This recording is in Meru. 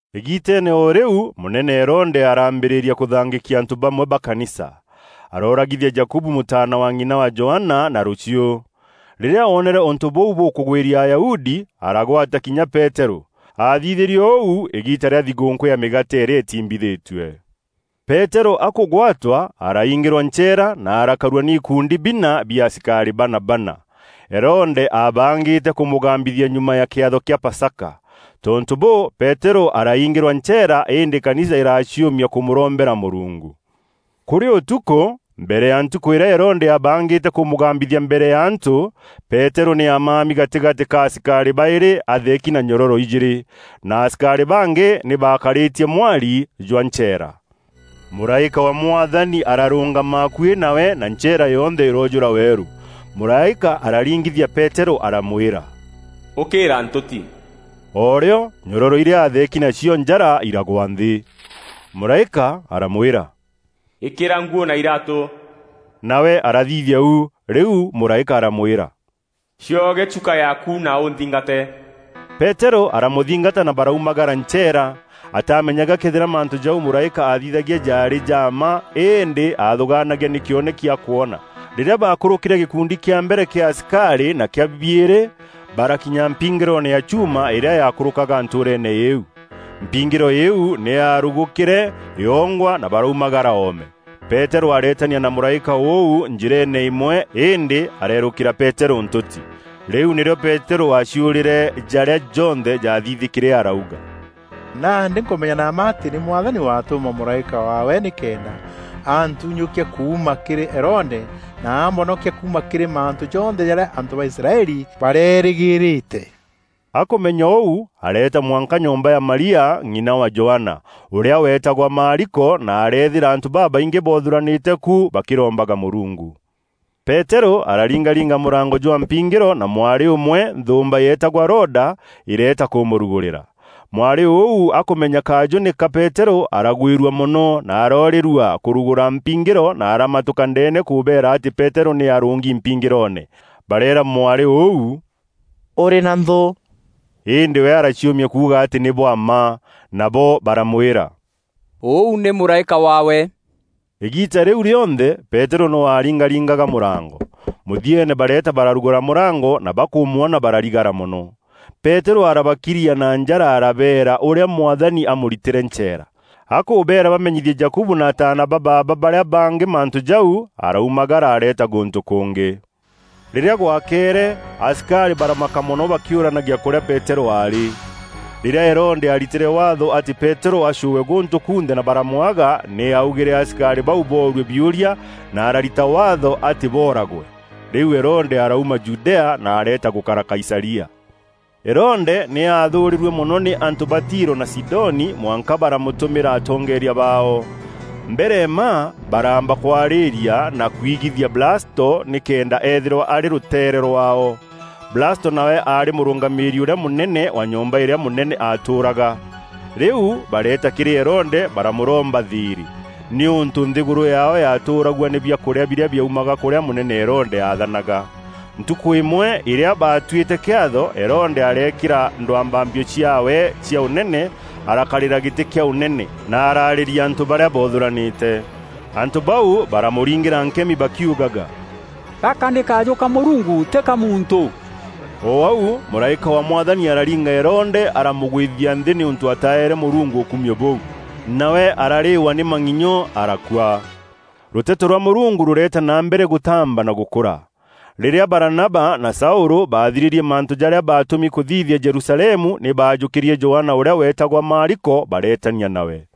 Îgiiteene o rîu mûnene Herode araambîrîria kûthangîkia antû bamwe ba kanisa. Arooragithia Jakubu mûtaana wa ng'ina wa Johana na rûchiû. Rîrîa oonere ûntû bûu bûkûgwîria Ayahudi, aragwata kinya Peterû. Aathithîrie ûu îgiita rîa thigûûnkû ya Mîgaate îrîa îtiimbithîtue. Peterû akûgwatwa, araingîrwa ncheera na arakarua nî ikundi bina bia asikarî bana bana. Herode aabangîte kûmûgambithia nyuma ya kîatho kîa Pasaka. Tontû bûû, Peterû araingîrwa ncheera îndî kanisa îraciûmia kûmûrombera Mûrungu. Kûrî ûtukû, mbere ya ntukû îrîa Herode aabangîte kûmûgambîthia mbere ya antû, Peterû nî aamami gatîgatî ka asikarî baîrî atheeki na nyororo ijîîrî, na asikarî bangî nî baakarîtie mwari jwa ncheera. Mûraîka wa Mwathani ararûngama akuî nawe na ncheera yonthe îroojûra weerû. Mûraîka araringithia Peterû aramwîra, “Ûkîîra ntûti!” O rîo nyororo irîa atheeki nacio njara iragwa nthî. Mûraîka aramwîra, “Îkîra nguû na iraatû.” Nawe arathithia u. Rîu mûraîka aramwîra, “Cioge chuka yaaku na ûnthingate.” Peterû aramûthingata na baraumagara ncheera. Ataamenyaga këethîra mantû jau mûraîka aathithagia jaarî ja mma îndî aathûgaanagia nî kîoneki akwoona. Rîrîa baakûrûkîre gîkundi kîa mbere kîa asikarî na kîa biîrî, barakinya mpingîroone ya chuuma îrîa yaakûrûkaga ntûûreene îîu. Mpingîro îîu nî yaarugûkîre yongwa na baraumagara oome. Peterû areetania na mûraîka ûu njîreene îmwe îndî areerûkîra Peterû ntûti. Rîu nîrîo Peterû aaciûrîre jarîa jonthe jaathithîkîre arauga, “Nandî nkûmenya na mma atî nî Mwathani watûma mûraîka waawe nîkenda antunyûkia kuuma kîrî Herode na ambonokia kuuma kîrî mantû jonthe jarîa antû ba Israeli bareerîgîîrîte.” Akûmenya ûu, areeta mwanka nyomba ya Maria, ng'ina wa Johana, ûrîa weetagwa Maariko na arethîra antû babaingî boothûranîte ku bakîrombaga Mûrungu. Peterû araringaringa mûrango jwa mpingîro na mwarî ûmwe, nthûûmba yeetagwa Roda, îreeta kûmûrugûrîra. Mwarî ûu akûmenya kajû nî ka Peterû, aragwîrua mono na aroorîrua kûrugûra mpingîro na aramatûka ndeene kûbeera atî Peterû nî arûngi mpingîroone. Bareera mwarî ûu, “Ûrî na nthû?” Îndî we araciûmia kuuga atî nî bwa mma. Nabo baramwîra, “Ûu nî mûraîka waawe.” Îgiita rîu rîonthe Peterû noo aaringaringaga mûrango. Mûthieene bareeta bararugûra mûrango, na bakûmwona bararigara mono. Peterû arabakiria na njara arabeera ûrîa Mwathani aamûritîre ncheera. Akûbeera bamenyithie Jakubu na ataana ba baaba barîa bangî mantû jau, araumagara areeta gûntû kûngî. Rîrîa gwakeere asikarî baramaka mono bakîûranagia kûrîa Peterû aarî. Rîrîa Herode aaritîre Waatho atî Peterû acûûwe gûntû kunthe na baramwaga, nî augîre asikarî bau boorue biûria na ararita waatho atî booragwe. Rîu Herode arauma Judea, na areeta gûkara Kaisaria. Herode nî aathûûrîrue mono nî antû ba Tiro na Sidoni mwanka baramûtûmîra atongeeria baao. Mbere mma, baraamba kwarîria na kwigithia Blasto nîkenda eethîrwa arî rûteere rwaao. Blasto nawe aarî mûrûngamîîri ûrîa mûnene wa nyomba îrîa mûnene aatûûraga. Rîu bareeta kîrî Herode baramûromba thîîrî, nîûntû nthîgûrû yaao yaatûûragua nî biakûrîa birîa biaumaga kûrîa mûnene Herode aathanaga. Ntukû îmwe îrîa, baatuîte kîatho, Herode areekîra ndwambambio ciaawe cia ûnene, arakarîra gîtî kîa ûnene, na araarîria antû barîa boothûranîte. Antû bau baramûringîra nkemi bakiugaga, “Gaka nî kajû ka mûrungu, tî ka muntû.” O au, mûraîka wa Mwathani araringa Herode aramûgwîthia nthî nîûntû ataaere Mûrungu ûkumio bûu. Nawe ararîîwa nî mang'inyo arakua. Rûteto rwa Mûrungu rûreta na mbere gûtaamba na gûkûra. Rîrîa Baranaba na Saûlû baathirîrie mantû jarîa baatûmi kûthithia Jerusalemu nî baajûkîrie Johana ûrîa weetagwa Maariko bareetania nawe.